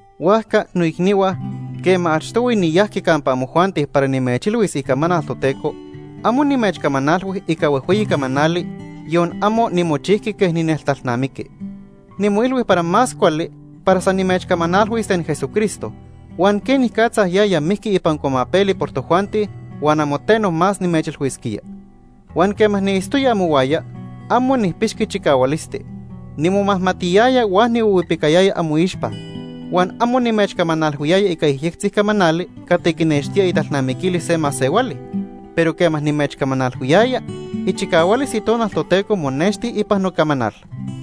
Huajca, noicnihua, quema achtohui niyajqui campa amojuanti para nimechilhuis icamanal Toteco, amo nimechcamanalhui ica huejhueyi camanali, yon amo nimochijqui quej nineltalnamiqui. Nimoilhui para más cuali para san nimechcamanalhuis ten Jesucristo huan quenicatza yaya mijqui ipan cuamapeli por tojuanti huan amo teno más nimechilhuisquía. Huan quema niitztoya amohuaya, amo nijpixqui chicahualisti. Nimomajmatiyaya huan nihuihuipicayaya amoixpa. Huan amo nimechcamanalhuiyaya ica yejyectzi camanali cati quinextía italnamiquilis se masehuali, pero quema nimechcamanalhuiyaya, ichicahualis Itonal Toteco monexti ipan nocamanal.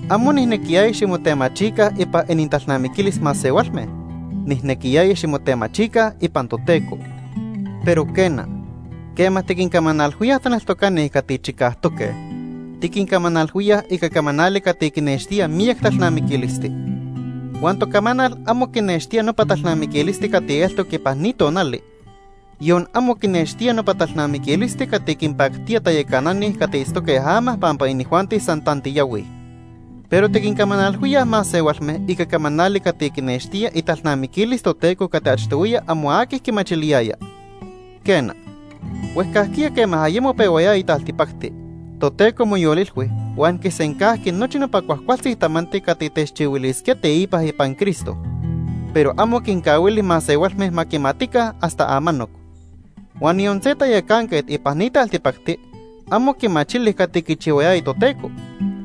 Amo nijnequiyaya ximotemachica ipan inintalnamiquilis masehualme, nijnequiyaya ximotemachica ipan Toteco. Pero quena, quema tiquincamanalhuíaj taneltocani cati chicajtoque, tiquincamanalhuíaj ica camanali cati quinextía miyac talnamiquilisti. Huan tocamanal amo quinextía nopa talnamiquilisti cati eltoc ipan ni tonali, yon amo quinextía nopa talnamiquilisti cati quinpactía tayacanani cati itztoque ama pampa inijuanti san tantiyahuij. Pero tiquincamanalhuíaj masehualme ica camanali cati quinextía italnamiquilis Toteco cati achtohuiya amo aqui quimachiliyaya. Quena, huejcajquiya quema ayemo pehuayaya taltipacti, Toteco moyolilhui huan quisencajqui nochi nopa cuajcualtzi tamanti cati techchihuilisquía teipa ipan Cristo, pero amo quincahuili masehualme ma quimatica hasta amanoc. Huan yon se tayacanquet ipan ni taltipacti amo quimachili cati quichihuayaya Toteco,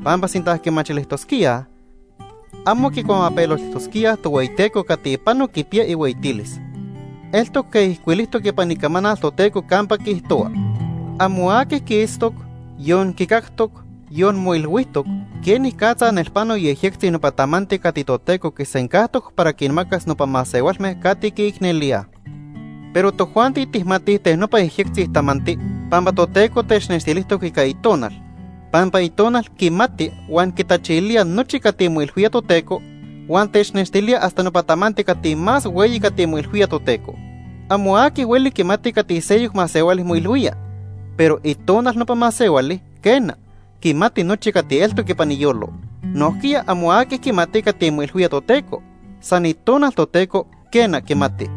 pampa sinta quimachilijtosquíaj, amo quicuamapeloltijtosquíaj Tohueyiteco cati pano quipiya ihueyitilis. Eltoc quej ijcuilijtoc ipan Icamanal Toteco campa quiijtohua: “Amo aqui quiitztoc, yon quicactoc, yon moilhuijtoc, quenicatza nelpano yejyectzi nopa tamanti cati Toteco quisencajtoc para quinmacas nopa masehualme cati quiicnelíaj.” Pero tojuanti tijmatij ten nopa yejyectzi tamanti pampa Toteco technextilijtoc ica Itonal, pampa Itonal quimati huan quitachilía nochi cati moilhuía Toteco huan technextilía hasta nopa tamanti cati más hueyi cati moilhuía Toteco. Amo aqui hueli quimati cati seyoc masehuali moilhuía, pero itonal nopa masehuali, quena, quimati nochi cati eltoc ipan iyolo. Nojquiya amo aqui quimati cati moilhuía Toteco, san Itonal Toteco, quena, quimati.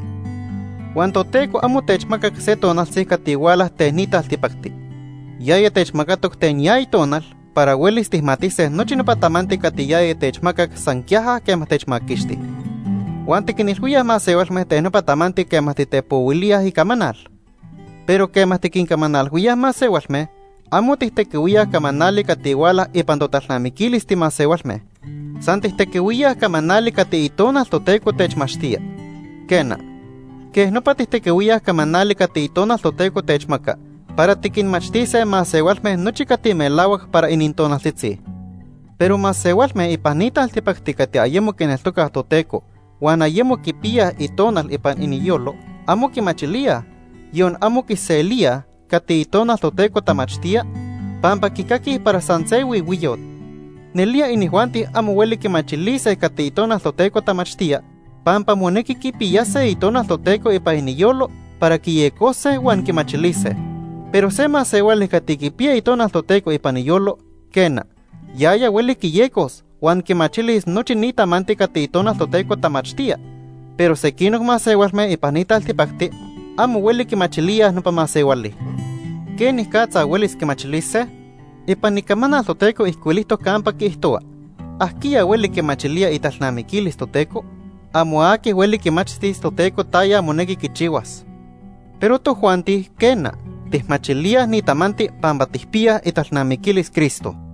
Huan Toteco amo techmacac se tonaltzi cati huala ten ni taltipacti. Yaya techmacatoc ten ya Itonal para huelis tijmatise nochi nopa tamanti cati yaya techmacac san quiaja quema techmaquixti. Huan tiquinilhuíaj masehualme ten nopa tamanti quema titepohuilíaj icamanal. Pero quema tiquincamanalhuíaj masehualme, amo tijtequihuíaj camanali cati huala ipan totalnamiquilis timasehualme, san tijtequihuíaj camanali cati Itonal Toteco techmachtía. Quena, quej nopa tijtequihuíaj camanali cati Itonal Toteco techmaca para tiquinmachtise masehualme nochi cati melahuac para inintonaltzitzi. Pero masehualme ipan ni taltipacti cati ayemo quineltocaj Toteco huan ayemo quipiyaj Itonal ipan iniyolo amo quimachilíaj, yon amo quiselíaj, cati Itonal Toteco tamachtía, pampa quicaquij para san se huihuiyot. Nelía inijuanti amo hueli quimachilise cati Itonal Toteco tamachtía pampa monequi quipiyase Itonal Toteco ipan iniyolo para quiyecose huan quimachilise. Pero se masehuali cati quipiya Itonal Toteco ipan iyolo, quena, yaya hueli quiyecos huan quimachilis nochi ni tamanti cati Itonal Toteco tamachtía, pero sequinoc masehualme ipan ni taltipacti amo hueli quimachilíaj nopa masehuali. ¿Quenicatza huelis quimachilise? Ipan Icamanal Toteco ijcuilijtoc campa quiijtohua: “¿Ajquiya hueli quimachilía italnamiquilis Toteco? Amo aqui hueli quimachtis Toteco taya monequi quichihuas.” Pero tojuanti, quena, tijmachilíaj ni tamanti pampa tijpiyaj italnamiquilis Cristo.